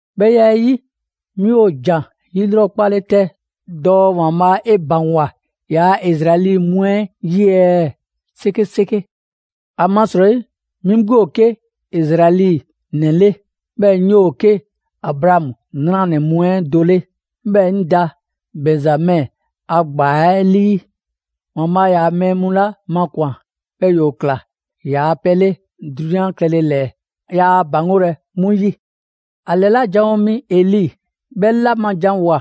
'Bhɛ ya 'ɛ 'yi, 'mi ‑o ‑jan 'yilrɔkpale 'tɛ dɔɔ ‑Waanbhaa' 'e ‑baŋgwa ‑yaa' Izraɛli mu 'ɛ 'yi ɛɛ? 'Sekeseke! ‑Amasrɔyi 'mi 'gbu ‑o 'ke Izraɛli ‑nɛ 'le, 'bhɛɛ‑ 'ŋ 'yoo‑ 'ke Abraamu 'nranɛ‑ mu 'ɛ do 'le, 'bhɛɛ‑ 'ŋ da Bɛnzamɛ a ‑gbaa 'ɛ 'lii. ‑Waanbhaa' ‑yaa' mɛɛ mu 'la makwan‑, 'bhɛɛ‑ ‑yoo ꞊kla ‑yaa' pɛ 'le 'drunyan klɛle ‑lɛɛ, yaa ‑a ‑baŋgolɛ 'mu 'yi. ‑A ‑lɛla' janwo mi Eli 'bhɛ 'la ma janwoa‑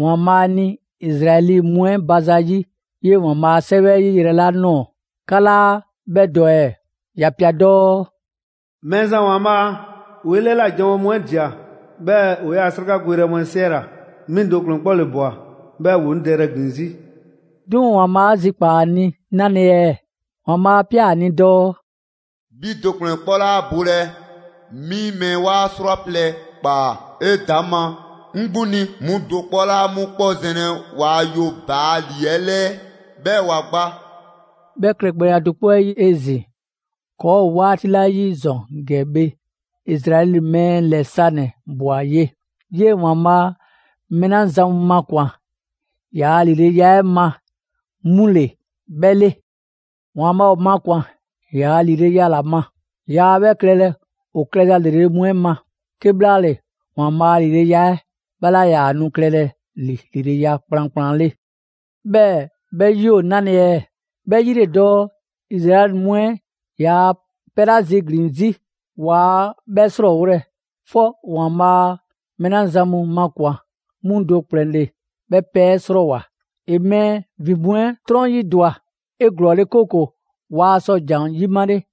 ‑Waanbhaa' ni Izraɛli mu 'ɛ ba zayi' 'yee‑ ‑Waanbhaa' a 'Sɛwɛ 'ɛ 'yi yrɛ 'la ꞊nɔɔ, 'ka 'laa 'bhɛ dɔ ɛɛ? ‑Ya ꞊pia dɔɔ: «Mɛɛzan ‑Waanbhaa', ‑woo' 'e 'lɛla꞊ janwo mu 'ɛ ꞊dia, 'bhɛɛ‑ ‑o 'yaa‑ 'srakagoyrɛ mu 'ɛ 'siɛla‑. 'Mi do ‑kplɛn 'kpɔ ‑le ꞊bwa, 'bhɛɛ‑ ‑woo 'ŋ dɛyrɛ ‑glin 'zi.» 'Duŋ‑ ‑Waanbhaa' 'a zikpaa‑ ‑a ni 'nale‑ ɛɛ? ‑Waanbhaa' 'a ꞊pia ‑a ni dɔɔ: «'Bhi do ‑kplɛn 'kpɔ 'laa bolɛ. 'Mi mɛɛ 'waa 'srwaplɛ‑ ꞊kpaa 'edaŋma 'ŋ 'gbu ni. 'Mu do 'kpɔ 'laa 'mu 'kpɔ zɛnlɛ waa yoBaali'ɛ 'lɛɛ 'bhɛɛ‑ ‑wa gba.» 'Bhɛ klɛgbɛya do 'kpɔ 'ɛ 'yi 'ezin‑, ‑kɔɔ' ‑o 'waati 'la 'yi ‑zɔn ‑gɛ bhe, Izraɛli mɛɛ ‑lɛ sanɛ‑ ꞊bwa ye, 'yee‑ ‑Waanbhaa' mɛɛ 'la zan mu makwan‑ ‑yaa' ‑lileya 'ɛ ma 'mu ‑le 'bhɛ 'le. ‑Waanbhaa' ‑o makwan‑ ‑yaa' ‑lileya ‑la ma; yaa 'bhɛ klɛlɛ ‑o klɛza ‑lrele' mu 'ɛ ma. ['Kebhlaale ‑Waanbhaa' a ‑lileya 'ɛ 'bhɛ 'laa ‑yaa nu klɛlɛ ‑li ‑lileya kplankplan 'le.] 'Bhɛɛ‑ 'bhɛ 'yi ‑o 'nale‑ ɛɛ? 'Bhɛ 'yi ‑le dɔɔ Izraɛli mu 'ɛ 'yaa‑ pɛ 'la ziglin‑ 'zi, waa 'bhɛ 'srɔɔwolɛ, 'fɔ ‑Waanbhaa' mɛɛ 'la zan mu makwan‑ 'mu do ‑kplɛn ‑le 'bhɛ pɛ 'ɛ 'srɔɔwoa‑. ‑E mɛɛ ‑vin mu 'ɛ 'trɔn 'yi ‑dwa 'eglɔɔle 'kooko‑ waa sɔ ‑jan 'yimale.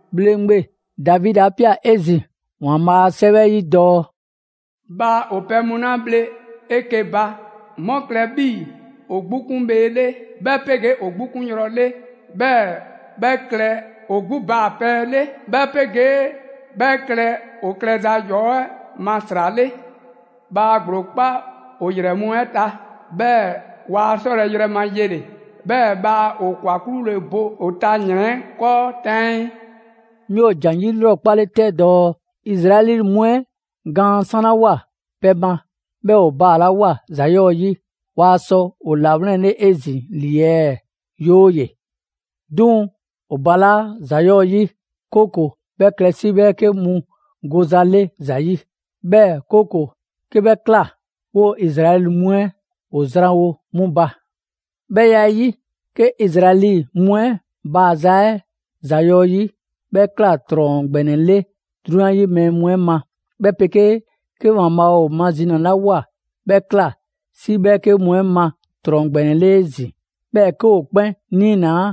‑Bhleŋgbe Davidi 'a ꞊pia 'ezin‑ ‑Waanbhaa' a 'Sɛwɛ 'ɛ 'yi dɔɔ: «Bhaa ‑o pɛ mu 'la bhle 'eke‑ ba, 'mu klɛ 'bhii‑ ‑o 'gbu 'kun bhee 'le, 'bhɛ 'pegee ‑o 'gbu 'kun yrɔ 'le, 'bhɛɛ‑ 'bhɛ klɛ ‑o 'gbu baa‑ pɛ 'le; 'bhɛ 'pegee 'bhɛ klɛ ‑o klɛza ‑yɔɔ' 'ɛ ma ‑sra 'le. Bhaa ‑gblo kpa ‑o ‑yrɛ mu 'ɛ ta, 'bhɛɛ‑ waa sɔ yrɛ ma yele‑. 'Bhɛɛ‑ bhaa ‑o ‑kwa 'klule‑ bo ‑o ta ‑yrɛn 'ɛ 'kɔɔ 'taŋii.» 'Mi ‑o ‑jan 'yilrɔkpale 'tɛ dɔɔ: Izraɛli mu 'ɛ gaan 'sanlawoa pɛ ma, 'bhɛɛ‑ ‑o baalawoa ‑za 'yɔɔ‑ 'yi, waa sɔ ‑o ‑lawlɛnle 'ezin‑ ‑li ɛɛ? 'Yooye‑! 'Duŋ‑ ‑o ‑balaa' ‑za 'yɔɔ‑ 'yi, 'kooko‑ 'bhɛ klɛ 'si 'bhɛɛke mu goza 'le ‑za yi; 'bhɛɛ‑ 'kooko‑ 'ke 'bhɛ ꞊kla, 'woo‑ Izraɛli mu ‑o zranwo 'mu ba. 'Bhɛ ya 'ɛ 'yi, 'ke Izraɛli mu 'ɛ baaza 'ɛ ‑za 'yɔɔ‑ 'yi, 'bhɛ ꞊kla ‑trɔn ‑gbɛnɛ 'le 'drunyan 'yi mɛɛ mu 'ɛ ma, 'bhɛ 'pegee 'ke ‑Waanbhaa' ‑o mazinalawoa 'bhɛ ꞊kla 'si 'bhɛɛke mu 'ɛ ma ‑trɔn ‑gbɛnɛ 'le 'ezin‑, 'bhɛɛ‑ 'ke ‑o 'kpɛn 'niinaa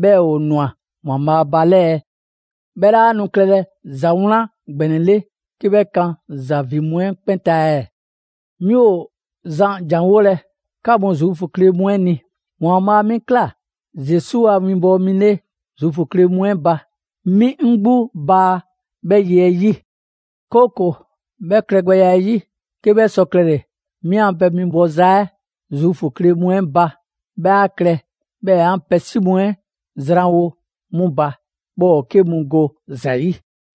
'bhɛɛ‑ ‑o ꞊nwa ‑Waanbhaa' ba 'lɛ ɛɛ? 'Bhɛ 'laa nu klɛlɛ ‑za 'wlan ‑gbɛnɛ 'le 'ke 'bhɛ kan ‑za ‑vin mu 'ɛ 'kpɛn ta ɛɛ? 'Mi ‑o zan ‑janwolɛ 'ka mu Zuufu kle mu 'ɛ ni. ‑Waanbhaa' 'mi ꞊kla Zesu a 'winbɔwo mi 'le Zuufu kle mu 'ɛ ba; 'mi 'ŋ 'gbu baa 'bhɛ ye 'ɛ 'yi. 'Kooko‑ 'bhɛ klɛgbɛya 'ɛ 'yi, 'ke 'bhɛ sɔ klɛle‑, 'mi a pɛ winbɔza 'ɛ Zuufu kle mu 'ɛ ba 'bhɛ 'a klɛ 'bhɛɛ‑ 'an pɛ 'si mu 'ɛ ‑o zranwo 'mu ba, 'bhɛɛ‑ ‑o 'ke mu go ‑za 'yi.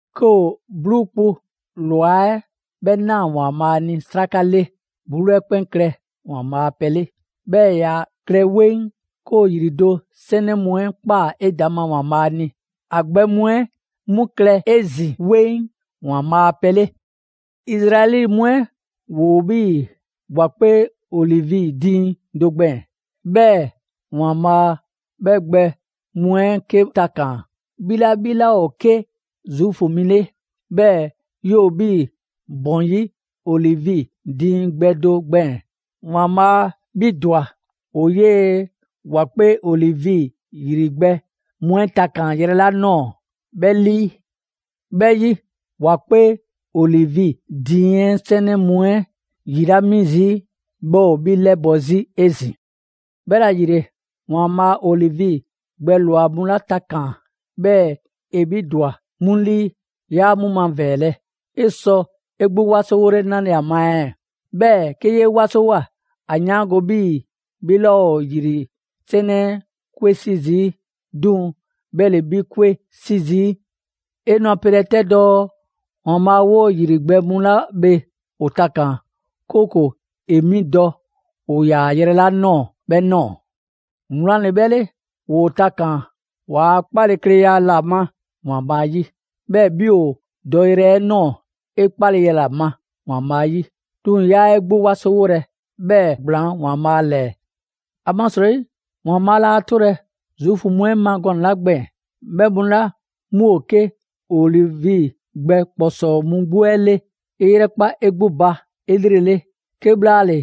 'Ke ‑o 'bluu kpu ꞊lwa 'ɛ 'bhɛ ꞊naa ‑Waanbhaa' ni 'sraka 'le, 'bluu 'ɛ 'kpɛn klɛ ‑Waanbhaa' a pɛ 'le, 'bhɛɛ‑ ‑ya klɛ 'weŋ. 'Ke ‑o ‑yri do 'sɛnɛ mu 'ɛ ꞊kpaa 'edaŋma ‑Waanbhaa' ni, ‑a gbɛ mu 'ɛ 'mu klɛ 'ezin‑ 'weŋ ‑Waanbhaa' a pɛ 'le. Izraɛli mu 'ɛ ‑woo 'bhii‑ ‑wa 'kpee olivi diiŋ do gbɛɛn‑, 'bhɛɛ‑ ‑Waanbhaa' 'bhɛ gbɛ mu 'ɛ 'ke takaan‑. 'Bhi 'la 'bhi 'laa ‑o 'ke Zuufu mi 'le, 'bhɛɛ‑ 'yoo‑ 'bhii‑ ‑bɔn 'yi olivi diiŋ gbɛ do gbɛɛn‑. ‑Waanbhaa' 'bhi ‑dwa ‑o 'yee‑ ‑wa 'kpee olivi ‑yri gbɛ mu 'ɛ takaan‑ yrɛ 'la ꞊nɔɔ 'bhɛ 'lii. 'Bhɛ 'yi, ‑wa 'kpee olivi diiŋ 'ɛ 'sɛnɛ mu 'ɛ ‑yi 'la 'mi zii', 'bhɛ ‑o 'bhi 'lɛbɔ‑ 'zi 'ezin‑. 'Bhɛla‑ ‑yile, ‑Waanbhaa' olivi gbɛ ꞊lwa mu 'la takaan‑, 'bhɛɛ‑ ‑e 'bhi ‑dwa 'mu 'lii, 'yaa 'mu mavɛɛlɛ. 'E sɔ 'e 'gbu 'wasowole 'nale‑ ‑a ma ɛɛ? 'Bhɛɛ‑ 'ke 'yee 'wasowoa, ‑a 'yaango‑ 'bhii‑ 'bhi 'laa ‑o ‑yri 'sɛnɛ 'ɛ 'kwe 'si zii', 'duŋ‑ 'bhɛ ‑le 'bhi 'kwe 'si zii'. 'E nu a pelɛ 'tɛ dɔɔ: «‑Waanbhaa' 'woo‑ ‑yri gbɛ mu 'la bhe ‑o takaan‑, 'kooko‑ ‑e 'mi dɔ ‑o ‑yaa yrɛ 'la ꞊nɔɔ‑ 'bhɛ ꞊nɔɔ.» Wlan ‑le 'bhɛ 'le! ‑Woo takaan‑ ‑waa' 'kpalekleya ‑la ma ‑Waanbhaa' 'yi. 'Bhɛɛ‑ 'bhi ‑o ‑o dɔyrɛ 'ɛ ꞊nɔɔ, 'e 'kpaleya ‑la ma ‑Waanbhaa' 'yi. 'Duŋ‑ 'yaa 'e 'gbu 'wasowolɛ, 'bhɛɛ‑ ‑gblaan' ‑Waanbhaa' ‑lɛɛ! ‑Amasrɔyi ‑Waanbhaa' laa 'tolɛ‑ Zuufu mu 'ɛ ma gɔnɛ‑ 'la gbɛɛn‑, 'bhɛ mu 'la 'mu ‑o 'ke olivi gbɛ ‑kpɔsɔɔ mu 'gbu 'ɛ 'le, 'e 'yrɛkpa 'e 'gbu ba 'elrele, 'kebhlaale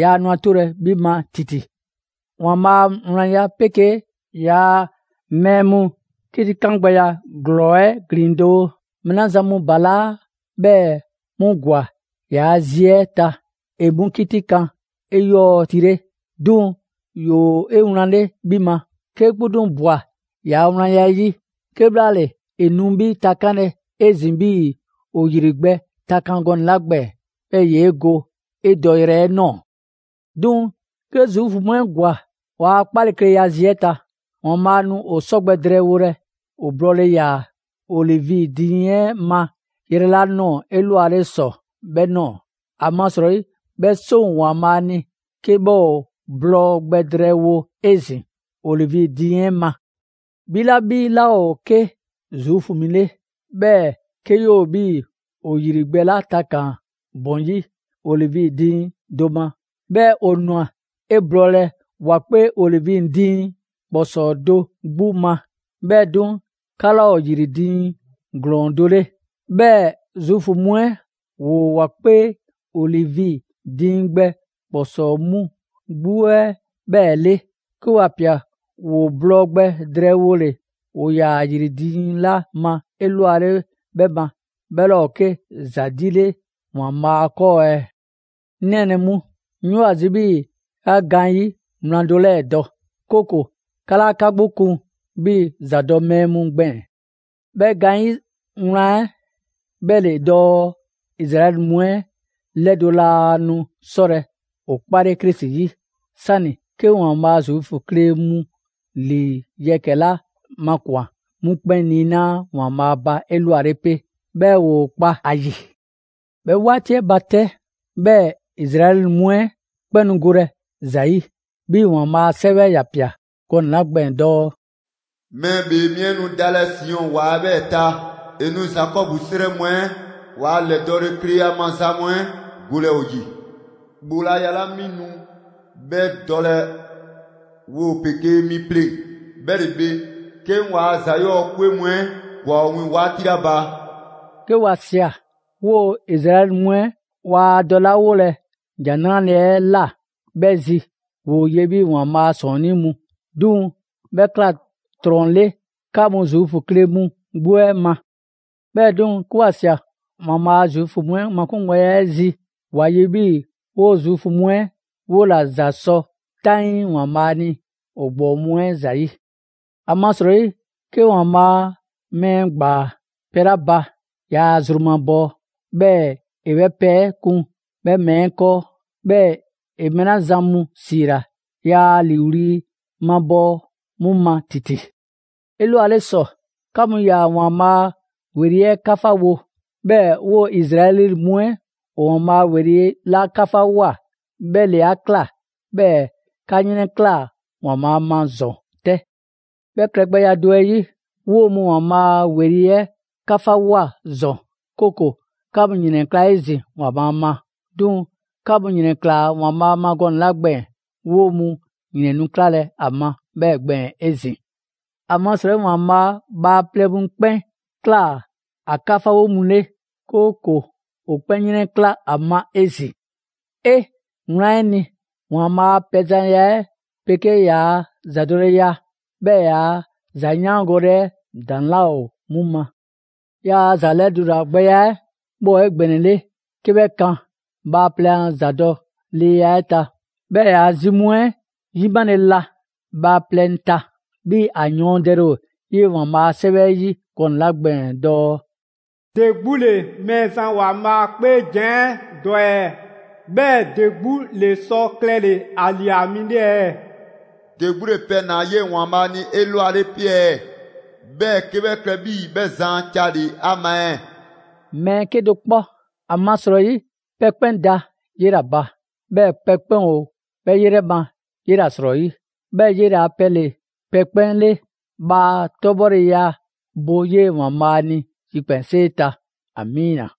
yaa nu ‑a 'tolɛ‑ 'bhi ma ‑titi. ‑Waanbhaa' a wlanya 'pegee ‑yaa' mɛɛ mu 'kitikan gbɛya ‑glɔɔ 'ɛ ‑glin doo: Mɛɛ 'la zan mu ‑balaa' 'bhɛɛ‑ 'mu ‑gwa ‑yaa' zi 'ɛ ta, ‑e 'mu 'kitikan 'eyɔɔtile. 'Duŋ‑ ‑yoo 'ewlanle 'bhi ma, 'kee 'gbu 'duŋ‑ ꞊bwa ‑yaa' wlanya 'ɛ 'yi; 'kebhlaale, ‑e nu 'bhi takanlɛ 'ezin‑ 'bhii‑ ‑o ‑yri gbɛ takan gɔnɛ‑ 'la gbɛɛn‑, 'bhɛɛ‑ ‑yee' go 'e dɔyrɛ 'ɛ ꞊nɔɔ. 'Duŋ‑ 'ke Zuufu mu 'ɛ ‑gwa ‑waa' 'kpalekleya zi 'ɛ ta, ‑Waanbhaa' nu ‑o 'sɔ gbɛ drɛɛwolɛ ‑o blɔɔle‑ ‑yaa olivi diiŋ 'ɛ ma yrɛ 'la ꞊nɔɔ 'elwale ‑sɔ 'bhɛ ꞊nɔɔ. ‑Amasrɔyi 'bhɛ 'seŋ ‑o ‑Waanbhaa' ni 'ke 'bhɛ ‑o blɔɔ gbɛ drɛɛwo 'ezin‑ olivi diiŋ 'ɛ ma. 'Bhi 'la 'bhi 'laa ‑o 'ke Zuufu mi 'le, 'bhɛɛ‑ 'ke 'yoo‑ 'bhii‑ ‑o ‑yri gbɛ 'la takaan‑ ‑bɔn 'yi olivi diiŋ do ma, 'bhɛɛ‑ ‑o ꞊nwa 'e blɔɔlɛ ‑wa 'kpee olivi diiŋ ‑kpɔsɔɔ do 'gbu ma; 'bhɛɛ‑ 'duŋ‑ 'ka 'laa ‑o ‑yri diiŋ ‑glɔɔn do 'le. 'Bhɛɛ‑ Zuufu mu 'ɛ, ‑woo ‑wa 'kpee olivi diiŋ gbɛ ‑kpɔsɔɔ mu 'gbu 'ɛ 'bhɛɛ‑ 'le, 'ke ‑wa ꞊pia ‑woo blɔɔ gbɛ drɛɛwole ‑o ‑yaa ‑yri diiŋ 'la ma 'elwale 'bhɛ ma, 'bhɛ 'laa ‑o 'ke ‑za 'di 'le ‑Waanbhaa' 'kɔɔ ɛɛ? 'Ŋ nɛɛnɛ‑ mu, 'ŋ 'yoo‑ ‑a zi 'bhii‑ 'ka gaanyi' wlan do 'lɛɛ‑ dɔ, 'kooko‑ 'ka 'laa 'ka 'gbu kun 'bhii‑ ‑zadɔ' mɛɛ mu gbɛɛn‑. 'Bhɛ gaanyi' 'wlan 'ɛ 'bhɛ ‑le dɔɔ Izraɛli mu 'ɛ 'lɛdo‑ laa nu 'sɔlɛ‑ ‑o 'kpale Krisi 'yi, 'sani 'ke ‑Waanbhaa' Zuufu kle mu ‑lii yɛkɛ‑ 'la makwan‑ 'mu 'kpɛn niinaa' ‑Waanbhaa' ba 'elwale 'pe, 'bhɛɛ‑ ‑woo kpa a ‑yi. 'Bhɛ 'waati 'ɛ ba 'tɛ, 'bhɛɛ‑ Izraɛli mu 'ɛ 'kpɛn nu golɛ ‑za 'yi, 'bhii‑ ‑Waanbhaa' a 'Sɛwɛ 'ɛ ‑ya ꞊pia gɔnɛ‑ 'la gbɛɛn‑ dɔɔ: «Mɛɛ ‑Bhee Mi 'ɛ nu dalɛ Siɔn ‑wa 'ɛ 'bhɛɛ‑ ta, ‑e nu Zakɔbu 'srɛ mu 'ɛ waa ‑lɛdɔɔkleya maza mu 'ɛ golɛ ‑o ‑yi. ‑Bhoolaya 'la 'mi nu 'bhɛ dɔlɛ 'woo‑ 'pegee 'mi 'pleŋ‑, 'bhɛ ‑le bhe, 'ke 'ŋ ‑waa' ‑za 'yɔɔ‑ 'kwe mu 'ɛ ‑gwa ‑o wiiŋ‑ 'waati 'la ba.» 'Ke ‑wa ꞊sia 'woo‑ Izraɛli mu 'ɛ waa dɔlawolɛ ‑Jan 'Nrale‑ 'ɛ ꞊la 'bhɛ zi, ‑woo ye 'bhii‑ ‑Waanbhaa' ‑sɔɔnnii' mu; 'duŋ‑ 'bhɛ ꞊kla 'trɔn‑ le 'ka mu Zuufu kle mu 'gbu 'ɛ ma. 'Bhɛɛ‑ 'duŋ‑, 'ke 'wa ꞊sia ‑Waanbhaa' Zuufu mu 'ɛ makungbɛya 'ɛ zi, 'wa 'ye 'bhii‑ 'woo‑ Zuufu mu 'ɛ 'wola‑ ‑za sɔ 'taŋii ‑Waanbhaa' ni ‑o ‑gbɔɔ mu 'ɛ ‑zayi'. ‑Amasrɔyi 'ke ‑Waanbhaa' mɛɛ ‑gbaa pɛ 'la ba, yaa zru mabɔɔ, 'bhɛɛ‑ ‑e 'bhɛ pɛ 'ɛ kun 'bhɛ mɛɛ 'ɛ 'kɔɔ. 'Bhɛɛ‑ ‑e mɛɛ 'la zan mu ‑siila, yaa ‑a ‑liiwli' mabɔɔ 'mu ma ‑titi. 'Elwale ‑sɔ, 'ka mu ‑yaa ‑Waanbhaa' ‑weli' 'ɛ 'kafawo. 'Bhɛɛ‑ 'woo‑ Izraɛli mu 'ɛ ‑o ‑Waanbhaa' ‑weli' 'la 'kafawoa, 'bhɛ ‑le 'a ꞊kla 'bhɛɛ‑ 'ka 'yrɛnklaa꞊ ‑Waanbhaa' ma ‑zɔn 'tɛ. 'Bhɛ klɛgbɛya do 'ɛ 'yi, 'woo‑ mu ‑Waanbhaa' ‑weli' 'ɛ 'kafawoa ‑zɔn, 'kooko‑ 'ka mu ‑yrɛnkla' 'ezin‑ ‑Waanbhaa' ma. 'Duŋ‑ 'ka mu ‑yrɛnklaa꞊ ‑Waanbhaa' ma gɔnɛ‑ 'la gbɛɛn‑, 'woo‑ mu ‑yrɛn nu 'klalɛ‑ ‑a ma 'bhɛɛ‑ gbɛɛn‑ 'ezin‑. ‑Amasrɔyi ‑Waanbhaa' bhaaplɛŋ mu 'kpɛn ꞊kla ‑a 'kafawo mu 'le, 'kooko‑ ‑o 'kpɛn 'yrɛnkla‑ ‑a ma 'ezin‑. 'Ee! Wlan 'ɛ ni, ‑Waanbhaa' a pɛzanya 'ɛ 'pegee ‑yaa' zadɔleya, 'bhɛɛ‑ yaa ‑zayaangole 'ɛ ‑daŋ' 'laa ‑o 'mu ma! ‑Yaa' ‑za lɛdulagbɛya 'ɛ 'bhɛ ‑o 'egbɛnɛle 'ke 'bhɛ kan bhaaplɛŋ a ‑zadɔleya 'ɛ ta. 'Bhɛɛ‑ ‑yaa' zi mu 'ɛ 'yimale la bhaaplɛŋ ta. 'Bhii‑ ‑a yɔɔndɛle ‑o 'yee‑ ‑Waanbhaa' a 'Sɛwɛ 'ɛ 'yi gɔnɛ‑ 'la gbɛɛn‑ dɔɔ: «‑De 'gbu ‑le Mɛɛzan ‑Waanbhaa' 'kpeejan‑ 'ɛ dɔ ɛɛ? 'Bhɛɛ‑ ‑de 'gbu ‑le sɔ klɛle‑ ‑a ‑lia mi 'le ɛɛ? ‑De 'gbu ‑le pɛ ꞊naa 'yee‑ ‑Waanbhaa' ni 'elwale 'pe ɛɛ, 'bhɛɛ‑ 'ke 'bhɛ klɛ 'bhii‑ 'bhɛ zan a ca 'le ‑a ma ɛɛ?» Mɛɛ 'kedo‑ 'kpɔ! ‑Amasrɔyi pɛ 'kpɛn da 'yela‑ ba, 'bhɛɛ‑ pɛ 'kpɛn ‑o 'bhɛ 'yrɛ ma 'yela‑ ‑srɔyi', 'bhɛɛ‑ 'yele‑ a pɛ ‑le pɛ 'kpɛn 'le. Bhaa 'tɔbhɔleya bo 'yee‑ ‑Waanbhaa' ni yikpɛnsee ta! Amiina.